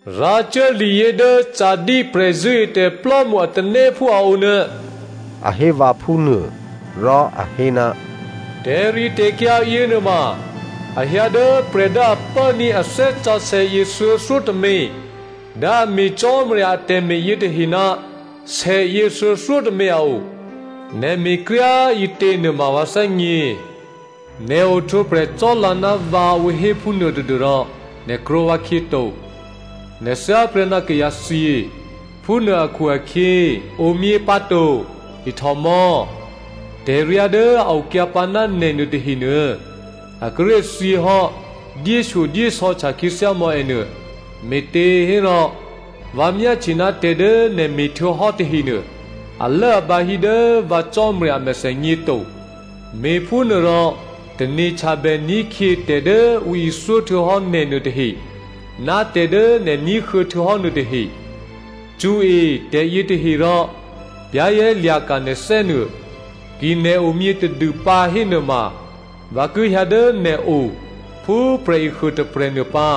“Rǎcuố liyě dố Sardi prè̤zṳ̂́etè̤plò́mṳ a tanéphú a o nuô,” a hé vǎ phúnuô rò a hé, “Tè̤ritè̤kyǎ yěnuôma a hyǎ dố prè̤ dố a pốní̤ a Thè́ Sǎsè̌ yěthuô̌thyótômě dố a me̤ Cò́marya atè̤me̤ yětahe ná sèyě thuô̌thyótômě a o. Nè̤ me̤kryá꤮ ǐtě nuôma vǎ thè́gně. Nè̤ ohtwǒprè̤ cò́lǎ ná vǎ ǔ hé phúnuô tadû́rò nè̤ krwǒ vǎkhyě to, nè̤ thyáprè́ná kayǎthyě. Phúnuô akhu-akhyě, omyě pǎto, ihtòmò̌, tè̤ryá dố a okyǎ pǎ ná nè̤ nuôtahenuô, a kíré̤ thyěhò́ dyéshyodyésò̌htya khyěthyá mò̌ ènuô, me̤těhérò, vǎ myáhtye ná tè̤ dố nè̤ me̤htuô̌hò́ tahenuô, alốabǎ hí dố vǎ Cò́marya a mèthènyě to. Me̤phúnuôrò tane̤htyabè ní̤khyě tè̤dố ǔ ithyó htuô̌hò́ nè̤nuô tahe ná tè̤dố nè̤ ní̤huô̌ htuô̌hò́ nuôtahe. Cṳ̌e tè̤yětahe rò za̤ ní̤ mò̌. Ki nè̤ omyě tadûpǎ hénuôma vǎ ki hyǎ dố nè̤o phú prè̤ehuô tôprè̤ nuô pǎ.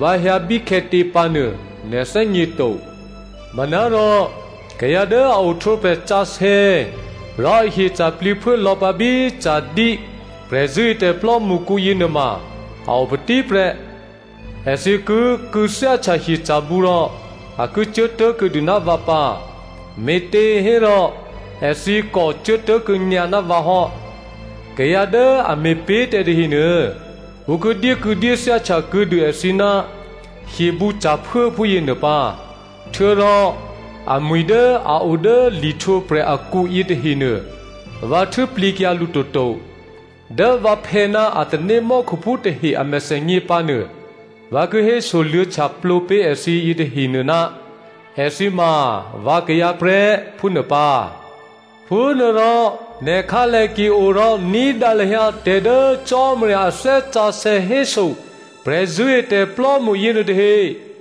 Vǎ hyǎ bíkhè̌tě pǎnuô nè̤ thè́gněto. “Manárò kayǎ dố a ohtwǒprè̤ sǎsè̌ rò ahyeca̤ plǐphuố lò̌pǎ bí Sardi prè̤zṳ̂́etè̤ plò́mṳkǔ yěnuôma a opatí prè́. Èthǐ ki kû̌thyáhtya hyeca̤bǔ rò a ki cuốtố̤ kuô̌dû ná vǎ pǎ, me̤těhérò èthǐ kò cuốtố̤kuô̌ nyǎ ná vǎ hò́. Kayǎ dố a me̤pé̤tè̤ tahenuô ǔ ki dyékû̌dyéthyá htyakuô̌dû èthǐ ná hyebǔca̤phuố phúyěnuô pǎ. Htuô̌rò amwi̤ dố a o dố lihtwǒprè̤ akǔ yětahenuô, vǎ htû́plǐkyǎ lǔ toto. Dố vǎphè̌ ná a tanémò́khuphú tahe a mèthènyě pǎnuô vǎ ki hésoluô̌htyaplǒ pé̤ èthǐ yětahenuô, èthǐ ma vǎkayǎ prè́, phúnuô pǎ. Phúnuôrò nè̤ khǎlè ki o rò ní̤dǎ lahyǎ tè̤ dố Cò́marya a Thè́ Sǎsè̌ héso prè̤zṳ̂́etè̤plò́mṳ yěnuôtahe.”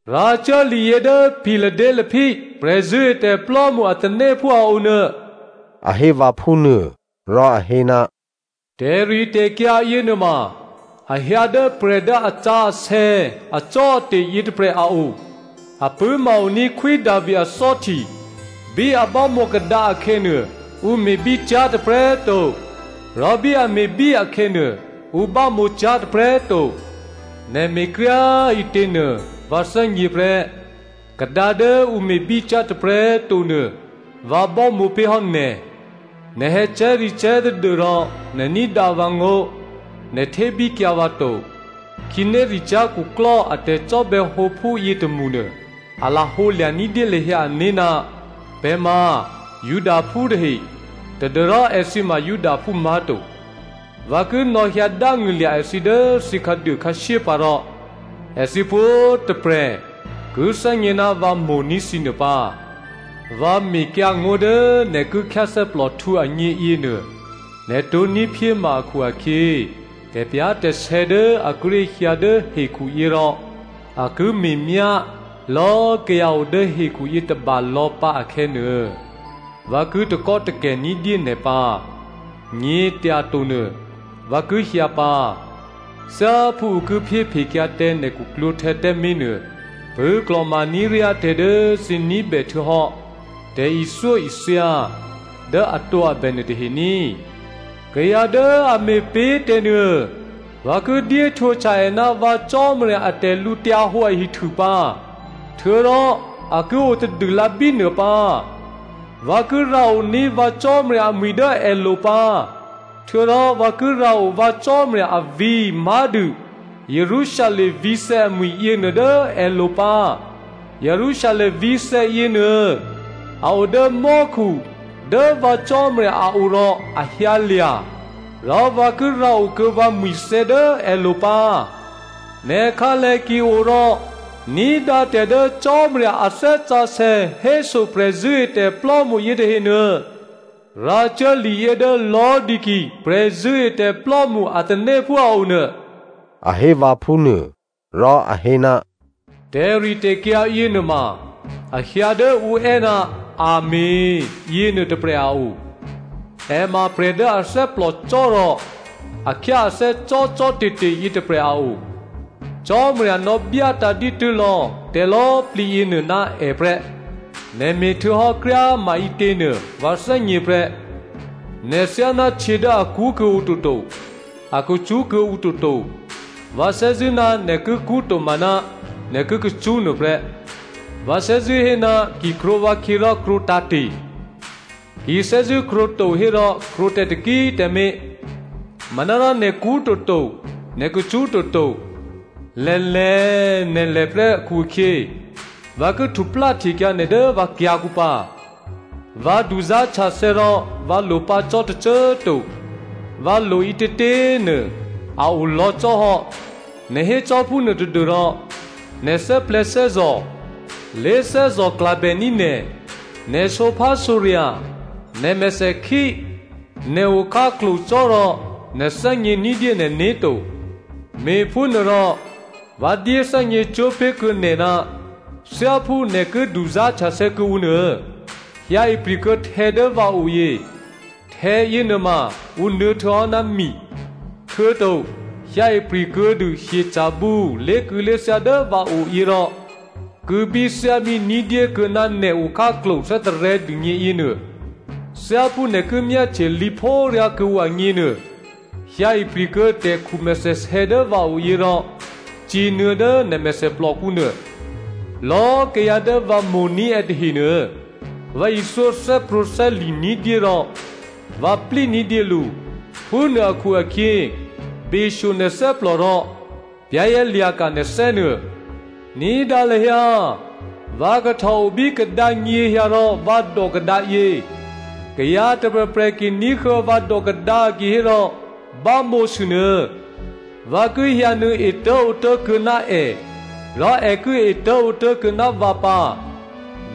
“Rǎcuố liyě dố Philadelphia prè̤zṳ̂́etè̤plò́mṳ a tanéphú a o nuô,” a hé vǎ phúnuô. Rò a hé, “Tè̤ritè̤kyǎ yěnuôma a hyǎ dố prè̤ dố asǎsè̌ acò́ate̤ yětôprè̤ a o. A pṳ̂́ma-o ní̤ Khwí Davi athò́hti. Bí a bámǒ kadǎ akhè̌nuô, ǔ me̤bícyá̤ tôprè̤꤮ to. Rò bí a me̤bí akhè̌nuô, ǔ bámǒcyá̤ tôprè̤꤮ to. Nè̤ me̤kryá꤮ ǐtěnuô vǎ thè́gně prè́. Kadǎ dố ǔ me̤bícyá̤ tôprè̤꤮ to nuô, vǎ bámǒ pé̤hò́ nè̤. Nè̤ hè̌cè̤́recè̤́ tadû́rò nè̤ ní̤dǎ vǎngó̤, nè̤ htébíkyǎ vǎ to. Khǐnéricyá̤ khuklò́ a tè̤cò́bè̌hǒphú yětômṳ nuô, a lahǒ lya̤ ní̤dyé lahyǎ ané̤ ná pè̤ ma Judaphú tahe, tadû́rò èthǐ ma Judaphú má̤to. Vǎ ki nò̌hyǎ dángṳ̂lya̤ èthǐ dố thǐ khǎduô khǎshyé pǎ rò èthǐ pwǒ̤꤮ tôprè̤ ki thè́gně ná vǎ mo̤ní̤ thǐ nuô pǎ. Vǎ mekyǎngó̤ dố nè̤ ki khyáthè́plòhtǔ agně yěnuô, nè̤ tǒ̤ní̤ phyéma akhu-akhyě, tè̤pyá̤tè̤sè̌ dố a kíré̤ hyǎ dố hekhuyě rò a ki me̤myá lò̌꤮ kayǎ odố hekhu yětôba lò̌pǎ akhè̌nuô, vǎ ki takò́takè̤ ní̤dyé nè̤ pǎ. “Nyě̤tyatonuô vǎ ki hyǎ pǎ. Thyáphú ǔ ki phyéphekyǎ tǎ nè̤ khuklwǒ̤htè̌ tǎmé̤nuô, pṳ̂́klò̤ma ní̤ ryá tè̤ dố thǐ ní̤bè htuô̌hò́, tè̤ithyóithya dố atǒabè nuô tahe ní꤮. Kayǎ dố a me̤pé̤ tè̤nuô, vǎ ki dyéhtwǒhtya è ná vǎ Cò́marya a tè̤lǔhǒdu ahihtû pǎ, htuô̌rò a ki o tadûlǎ bínuô pǎ. Vǎ ki rǎoní̤ vǎ Cò́marya amwi̤ dố èlo̤ pǎ. Htuô̌rò vǎ ki rǎo vǎ Cò́marya avǐ̤ má̤dû Jerusalem vǐ̤thè̌ amwi̤ yěnuô dố èlo̤ pǎ. Jerusalem vǐ̤thè̌ yěnuô, a o dố mò́khu dố vǎ Cò́marya a o rò a hyǎlya̤. Rò vǎ ki rǎokuô̌ vǎ mwi̤thè̌ dố èlo̤ pǎ. Nè̤ khǎlè ki o rò ní̤dǎ tè̤ dố Cò́marya a Thè́ Sǎsè̌ héso prè̤zṳ̂́etè̤plò́mṳ yětahenuô.” “Rǎcuố liyě dố Laodicea prè̤zṳ̂́etè̤plò́mṳ a tanéphú a o nuô,” a hé vǎ phúnuô. Rò a hé, “Tè̤ritè̤kyǎ yěnuôma a hyǎ dố ǔ è́, ‘Amèn’ yěnuô tôprè̤ a o. È ma prè̤ dố a thè́plòcò́ rò a khyá athè́ cò́cò́te̤te̤ yětôprè̤ a o. Cò́marya nò̌byátǎ̤ dǐtû́ lò̌ tè̤lò̌꤮ plǐ yěnuô ná è prè́. Nè̤ me̤ htuô̌hò́ kryá꤮ maǐtěnuô vǎ thè́gně prè́. Nè̤ thyáná htyě dố a kṳ́ kuô̌ǔ toto, a kacṳ́ kuô̌ǔ toto, vǎ thè́zṳ̂́ ná nè̤ ki kṳ́ tomaná nè̤ ki kacṳ́ nuôprè́. Vǎ thè́zṳ̂́ hé ná ki krwǒ vǎkhyě rò krwǒtǎ̤te̤. Ki thè́zṳ̂́ krwǒ to hérò krwǒ tǎ taki꤮ tǎmé̤. Manárò nè̤ kṳ́ toto, nè̤ kacṳ́ toto. Lè̤lè̤꤮ nè̤ lè̤prè́ akhu-akhyě vǎ ki htupláhtekyǎ nè̤ dố vǎ kyǎ̤kǔ pǎ. ‘Vǎ duzá̤htyathè̌ rò vǎ lo pǎ cò́ tôcô꤮ to, vǎ lo ǐtětě꤮ nuô a o lò̌ cò́ hò́,’ nè̤ hécò́ phúnuô tadû́rò nè̤ thè́plè̤̌thè́zò̤, lé̤꤮ thè́zò̤klabèní̤ nè̤, nè̤ sǒphásǒrya̤, nè̤ mèthèkhí, nè̤ okhǎklo̤ cò́꤮ rò nè̤ thè́gně ní̤dyé nè̤né̤ to. Me̤phúnuôrò vǎ dyéthè́gně cwó̤pé̤kuô̌ nè̤ ná thyáphú nè̤ ki duzá̤htyathè̌ kuô̌ǔ nuô, hyǎ ipri̤kuô̌ htè̌ dố vǎo yě. Htè̌ yěnuôma ǔ nuô̌htuô̌hò́ ná mi. Htuô̌to hyǎ ipri̤ kuô̌dû hyeca̤bǔ lé̤kû̌lé̤thyá dố vǎo yě rò kû̌bíthyábí ní̤dyé kuô̌ná nè̤ okhǎklo̤ thè́tarè̤̌ dûgně yěnuô. Thyáphú nè̤ ki myáhtye lǐphóryá kuô̌ǔ agněnuô, hyǎ ipri̤kuô̌ tè̤khu mèthèsè̌ dố vǎo yě rò cǐnuô̌ dố nè̤ mèthèplòkǔ nuô. “Lò̌꤮ kayǎ dố vǎ mo̤ní̤ è tahenuô, vǎ ithyó thè́prwǒ̤thè́li̤ ní̤dyé rò vǎ plí ní̤dyé lǔ. Phúnuô akhu-akhyě beshyo nè̤ thè́plò rò za̤ ní̤ mò̌. Ní̤dǎ lahyǎ꤮ vǎ kahtò obí kadǎ nyěhyǎ rò vǎ dò kadǎ yě. Kayǎ tôprè̤prè̤ ki ní̤huô̌ vǎ dò kadǎ kihé rò bámǒsû nuô, vǎ ki hyǎnuô̌ etố̤ǒtố̤ kuô̌ná è, rò è ki etố̤ǒtố̤ kuô̌ná vǎ pǎ.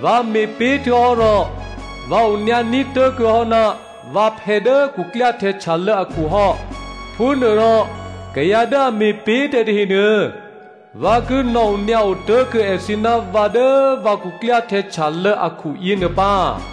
“Vǎ me̤pé̤ htuô̌hò́ rò vǎ onyǎní̤ tố̤kuô̌ hò́ ná vǎphè̌ dố khuklyáhtè̌ htyalô̌ akhu hò́. Phúnuôrò kayǎ dố a me̤pé̤tè̤ tahenuô, vǎ ki nò̌onyǎo tố̤kuô̌ èthǐ ná vǎ dố vǎ khuklyáhtè̌ htyalô̌ akhu yěnuô pǎ.